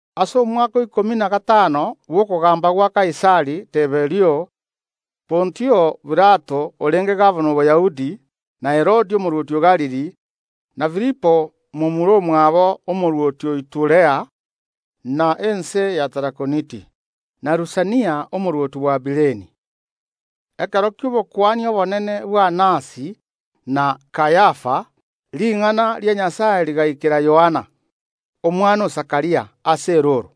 Ase omwaka o ikomi na gatano bw’okogamba gwa Kaisari Tiberio, Pontio Pilato orenge gabana o Boyahudi, na Herode omorwoti o Galili, na Filipo momura omwabo arenge omorwoti o Iturea na ense ya Tarakoniti, na Lusania omorwoti o Abileni, ekero ki’obokuani obonene bw’Anasi na Kayafa, ring’ana ria Nyasae rigaikera Yohana, omwana o Zakaria, ase erooro.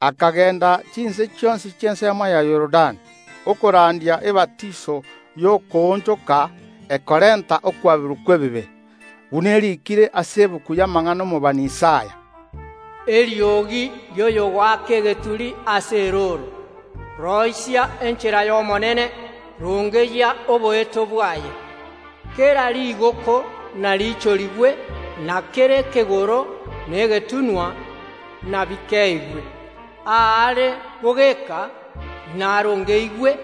Akagenda chinse chionsi chi’ensemo ya Yorodani, okorandia ebatiso y’okoonchoka ekorenta okwaberwa kw’ebibe. Buna eriikire ase egetabu y’amang’ana ’omobani Isaya, “Eriogi ri’oyogoaka egeturi ase erooro, Roisia enchera y’Omonene, rongeyia oboeto bwaye. Kera rigooko nariichorigwe, na kera ekegoro na egetunwa nabikeeigwe; aare bogeka inarongeigwe,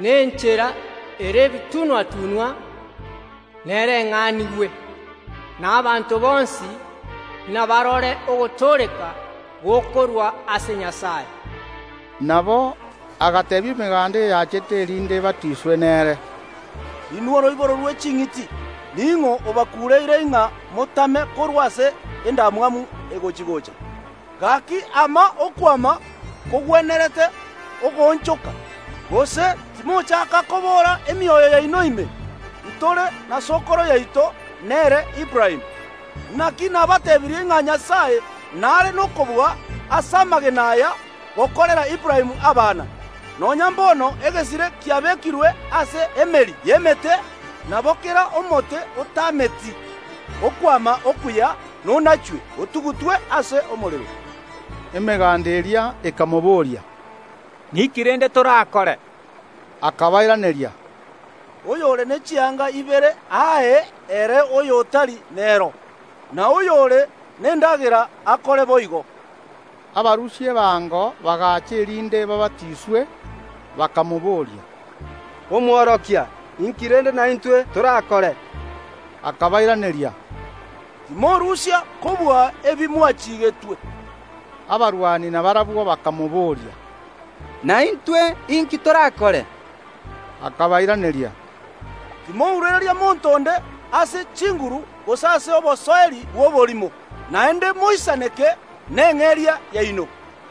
na enchera ere ebitunwa‐tunwa nereng’anigwe; na abanto bonsi nabarore ogotooreka gokorwa ase Nyasae.” Nabo agateebia emeganda eyachete, erinde ebatiswe nere, “Inwe oroiboro rwe ching’iti, ning’o obakuureire ng’a motame korwa ase endamwamu egochi‐gocha? Gaki, ama okwama kogwenerete okoonchoka, gose timochaaka kobora emioyo yaino ime: Ntore na sokoro yaito, nere Aburaamu. Naki nabateebirie ng’a Nyasae nare nokobua ase amagena aya gokorera Aburaamu abana. Nonya mbono egesire kiabekirwe ase emeri y’emete; nabo kera omote otameti okwama okuya nonachwe, otugutwe ase omorero.” Emeganda eria ekamoboria, “Ninki rende torakore?” Akabairaneria, “Oyore ne chianga ibere ae ere oyotari nero; na oyore nendagera akore boigo.” Abarusia ebango bagacha erinde babatiswe, bakamobooria, “Omworokia, inki rende naintwe torakore?” Akabairaneria, “Timorusia kobua ebi mwachigetwe.” Abasikari nabarabwo bakamobooria, “Naintwe inki torakore?” Akabairaneria, “Timourereria monto onde ase chinguru gose ase obosoeri bw’oborimo; naende moisaneke neng’eria yaino.”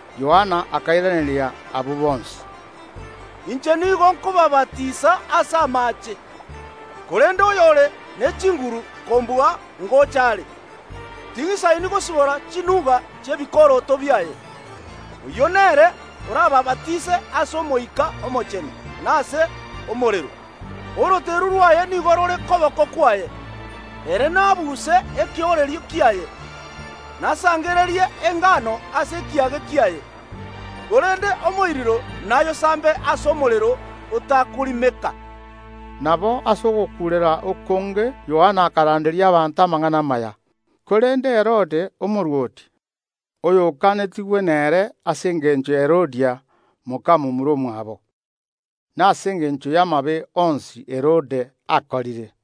Yohana akairaneria abwo bonsi, “Inche nigo nkobabatisa ase amaache, korende oyore ne chinguru kombua ngocha are, ting’isaini gosibora chiusi chi’ebikoroto biaye; oyio nere orabaabatise ase Omoika Omochenu na ase omorero. Oroteru rwaye nigo rore koboko kwaye, ere naabuse ekeooreri kiaye, nasangererie engano ase ekiage kiaye, korende omoiriro nayosambe ase omorero otakorimeka.” Nabo ase ogokuurera okonge Yohana akaranderia abanto amang’ana amaya. Korende Yohana agatogonyera Herode omorwoti, ase engencho y’okonyuoma Herodia, moka momura omwabo, na ase engencho y’amabe onsi Herode akorire,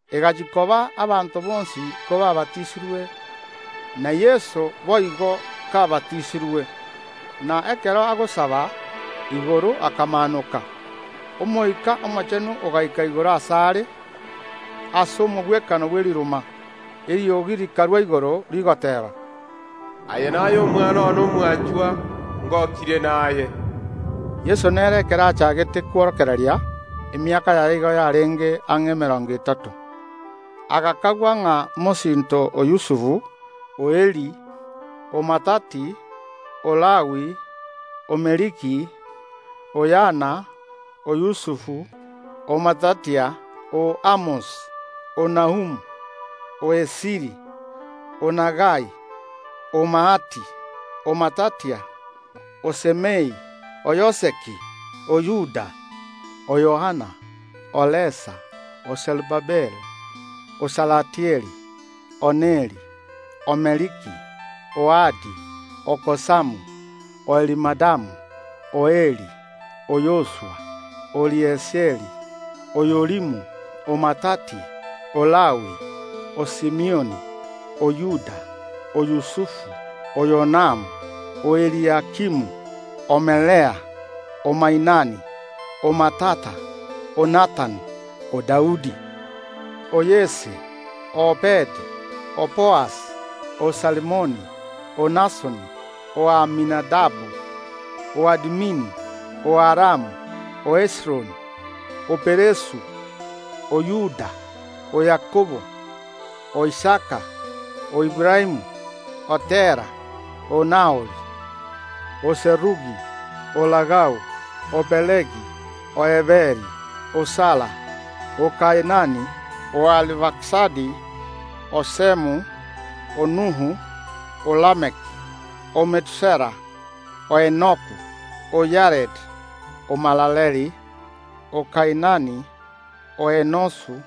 Egachia koba abanto bonsi kobaabatisirwe, na Yeso boigo kabatisirwe, na ekero agosaba, igoro akamaanoka. Omoika Omochenu ogaika igoro asare ase omogwekano bwe riruma, eriogi rikarwa igoro, rigoteeba, “Aye naye Omwana one omwanchwa, ngokirie naye.” Yeso nere ekero achagete kworokereria, emiaka yaye igo yarenge ang’e emerongo etato, agakagwa ng’a mosinto o Yusufu, o Eli, o Mathati, o Lawi, o Meliki, o Yana, o Yusufu, o Matathia, o Amos, o Nahum, o Esili, o Nagai, o Maathi, o Matathia, o Semei, o Yoseki, o Yoda, o Yohana, o Resa, o Serubabeli, o Salatieli, o Neri, o Meliki, o Adi, o Kosamu, o Elimadamu, o Eri, o Yoshua, o Eliezeri, o Yorimu, o Mathati, o Lawi, o Simioni, o Yuda, o Yusufu, o Yonam, o Eliakimu, o Melea, o Mainani, o Mattatha, o Nathani, o Daudi, o Yese, o Obedi, o Boazi, o Salimoni, o Nashoni, o Aminadabu, o Admin, o Aramu, o Hezironi, o Peresu, o Yuda, o Yakobo, o Isaka, o Aburaamu, o Tera, o Nahori, o Serugi, o Reu, o Pelegi, o Eberi, o Sala, o Kainani, o Arifakisadi, o Shemu, o Nuhu, o Lameki, o Metusela, o Enoku, o Yaredi, o Malaleeli, o Kainani, o Enosu,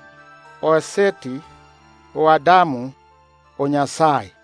o Seti, o Adamu, o Nyasae.